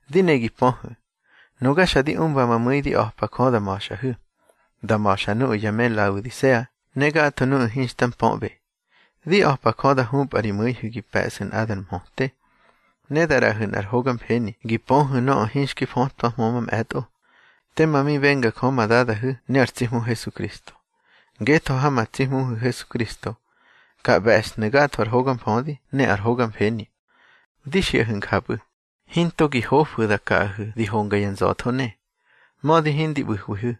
Di ne gi pöhu̱, nuga xa di umba ma mu̱i di a̱pa Jö da ma̱xꞌahu̱, da ma̱xa nuꞌu̱ ya me Laodisea ne gatho nuꞌu̱ hinxta mpöꞌbe. Di a̱pa Jö da hupꞌa ri mu̱ihu̱ gi pe̱ꞌsu̱ nꞌadar mhöte. Ne da ꞌraꞌahu̱ nꞌar hoga mfeni gi pöhu̱ nöꞌö hinxki fötwahmö mamꞌe̱tꞌo, tema mi benga Jö ma Dadahu̱ ne ar tsi Hmu Hesukristo. Ngetho ha ma tsi Hmuhu̱ Hesukristo, ka ꞌbe̱shnu̱ gatho ar hoga mfödi ne ar hoga mfeni. Di xiꞌahu̱ njapꞌu̱, hinto gi hofu̱ da kaꞌahu̱ di honga ya nza̱tho ne. Mödi hindi ꞌbu̱hwihu̱,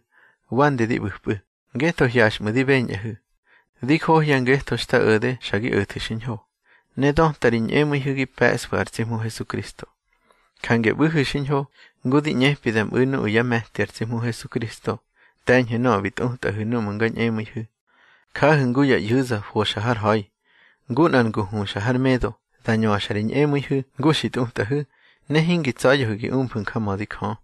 wande di ꞌbu̱pꞌu̱, ngetho hyaxꞌmu̱ di beñꞌahu̱. Di johya ngetho xta o̱de xa gi o̱thu̱ xiñho, ne döta ri ñꞌemu̱ihu̱ gi pe̱ꞌsfu̱ ar tsi Hmu Hesukristo. Jange ꞌbu̱hu̱ xiñho ngu di ꞌñepi da mꞌu̱ nuꞌu̱ yá me̱ti ar tsi Hmu Hesukristo. Te̱ñhu̱ nöꞌö bi tꞌutꞌahu̱ núꞌmu̱ nga ñꞌemu̱ihu̱. Jahu̱ ngu ya ꞌyu̱za foxa har ha̱i, ngu nꞌar ngu huxa har medo, dá ñöxa ri ñꞌemu̱ihu̱ ngu xi tꞌutꞌahu̱, ne hingi tsa̱ya̱hu̱ gi umfu̱ njamödi Jö.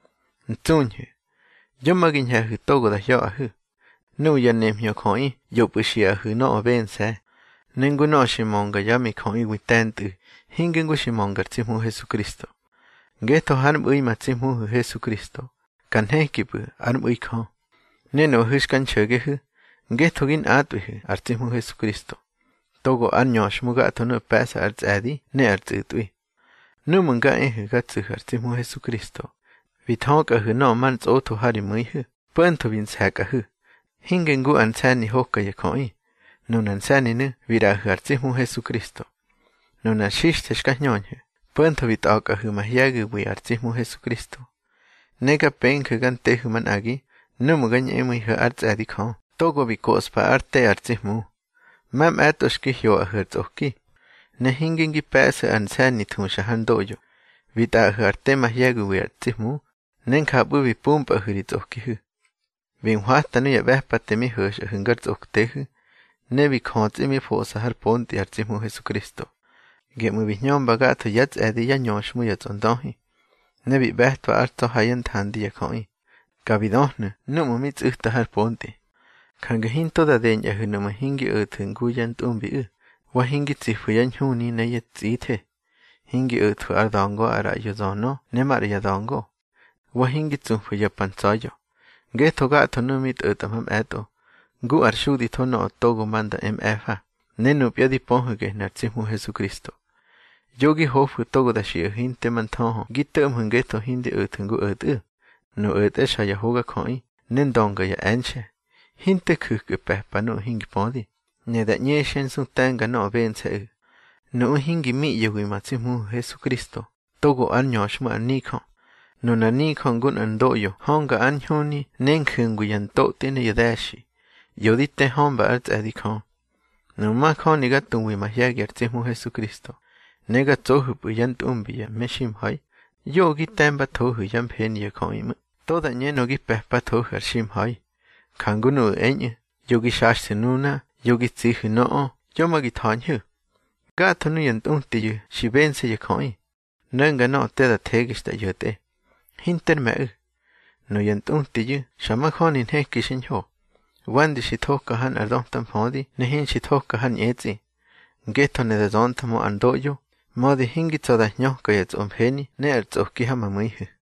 Ntsuñhu̱, yo ma gi ñhe̱hu̱ togo da hya̱ꞌahu̱. Nuꞌu̱ ya nemhñö jöꞌi ꞌyopꞌu̱ xiꞌahu̱ nöꞌö bense̱, ne ngu nöꞌö xi mönga yá mijöꞌiwi te̱ntꞌu̱, hinge ngu xi mönga ar tsi Hmu Hesukristo. Ngetho hár mꞌu̱i ma tsi Hmuhu̱ Hesukristo, ka nhekipꞌu̱ ár mꞌu̱i Jö. Ne nuꞌahu̱ xka nxo̱gehu̱, ngetho gi nꞌatꞌwihu̱ ar tsi Hmu Hesukristo, togo ár ñöxhmu gatho nuꞌu̱ pe̱ꞌsa ar tsꞌe̱di ne ar tsꞌu̱tꞌwi. Núꞌmu̱ nga ehu̱ ga tsu̱hu̱ ar tsi Hmu Hesukristo, bi thökꞌahu̱ nöꞌö mar ntsꞌotho ha ri mu̱ihu̱, po̱ntho bi nse̱kꞌahu̱; hinge ngu ar nse̱ni hoka ya jöꞌi. Nunar nse̱ninu̱ bi ꞌraꞌahu̱ ar tsi Hmu Hesukristo. Nunar xixthe xka hñöhu̱, po̱ntho bi tꞌa̱kꞌahu̱ mahye̱giwi ar tsi Hmu Hesukristo. Ne ga penju̱ ga ntehu̱ manꞌagi núꞌmu̱ ga ñꞌemu̱ihu̱ ár tsꞌe̱di Jö, togo bi koꞌspa ár te ar tsi Hmu. Mamꞌe̱tꞌo xki hyoꞌahu̱ ar tsꞌoki, ne hinge ngi pe̱ꞌsu̱ ar nse̱ni thuxa har ndoꞌyo. Bi tꞌaꞌahu̱ ar te mahye̱giwi ar tsi Hmu, ne njapꞌu̱ bi pumpꞌahu̱ ri tsꞌokihu̱. Bi nhwata nuya ꞌbe̱pate mi ho̱xꞌahu̱ ngar tsꞌoktehu̱, ne bi jötsꞌi bi foꞌsa hár pontꞌi ar tsi Hmu Hesukristo. Geꞌmu̱ bi hñömba gatho yá tsꞌe̱di yá ñöxhmu ya tsꞌondöhi, ne bi ꞌbe̱twa ár tsa̱ ha yá nthandi ya jöꞌi. Ka bi döhnu̱ núꞌmu̱ mi tsꞌu̱ta har pontꞌi. Jange hinto da deñꞌahu̱ nuꞌmu̱ hingi o̱thu̱ ngu yá ntꞌumbiꞌu̱, wa hingi tsifu̱ yá ñhuni ne yá tsꞌithe, hingi o̱thwu̱ ár da̱ngo ar ꞌraꞌyo zönö ne maꞌra ya da̱ngo, wa hingi tsufu̱ ya pa ntsa̱ya̱. Ngetho gatho nuꞌu̱ mi tꞌo̱tꞌa mamꞌe̱tꞌo, ngu ár xuditho nöꞌö togo ma nda e mꞌe̱fa, ne nupya di pöhu̱ gehnu̱ ar tsi Hmu Hesukristo. Yo gi hofu̱ togo da xiꞌahu̱ hinte ma nthöhö gi to̱ꞌmhu̱ ngetho hingi o̱thu̱ ngu o̱tꞌu̱. Nuꞌu̱ o̱tꞌe xa ya hogajöꞌi, ne ndönga ya e̱nxe̱. Hinte ju̱kꞌu̱ pe̱pa nuꞌu̱ hingi pödi, ne da ꞌñexyá nsu te̱nga nöꞌö bense̱ꞌu̱. Nuꞌu̱ hingi miꞌye̱wi ma tsi Hmuhu̱ Hesukristo togo ár ñöxhmu ar nijö. Nunar nijö ngu nꞌar ndoꞌyo hönga ár ñhuni ne nju̱ngwi ya ntotꞌi ne ya de̱xi, ꞌyo di te hömba ár tsꞌe̱di Jö. Nuꞌmu̱ majöni ga tuwihu̱ mahye̱gi ar tsi Hmu Hesukristo, ne ga tsohu̱pꞌu̱ yá ntꞌumbi ya meximha̱i, yoꞌö gi te̱mbathohu̱ yá mfeni ya jöꞌi ꞌmu̱, to da ꞌñenö gi pe̱pathohu̱ ar ximha̱i. Jangu nuꞌu̱ eñꞌu̱: Yo gi xaxthu̱ nuna, yo gi tsihu̱ nöꞌö, yo ma gi tha̱ñhu̱. Gatho nuya ntꞌutiyu̱ xi bense̱ ya jöꞌi, no̱nga nöꞌö te da thege xta ꞌyo̱tꞌe, hinter me̱ꞌu̱. Nuya ntꞌutiyu̱ xa majöni nheki xiñho, wande xi thoka ha nꞌar döta mfödi ne hinxi thoki har ñꞌetsꞌi. Ngetho ne da zönthmö ar ndoꞌyo, mödi hingi tsa̱ da hñöka ya tsꞌomfeni ne ar tsꞌoki ha ma mu̱ihu̱.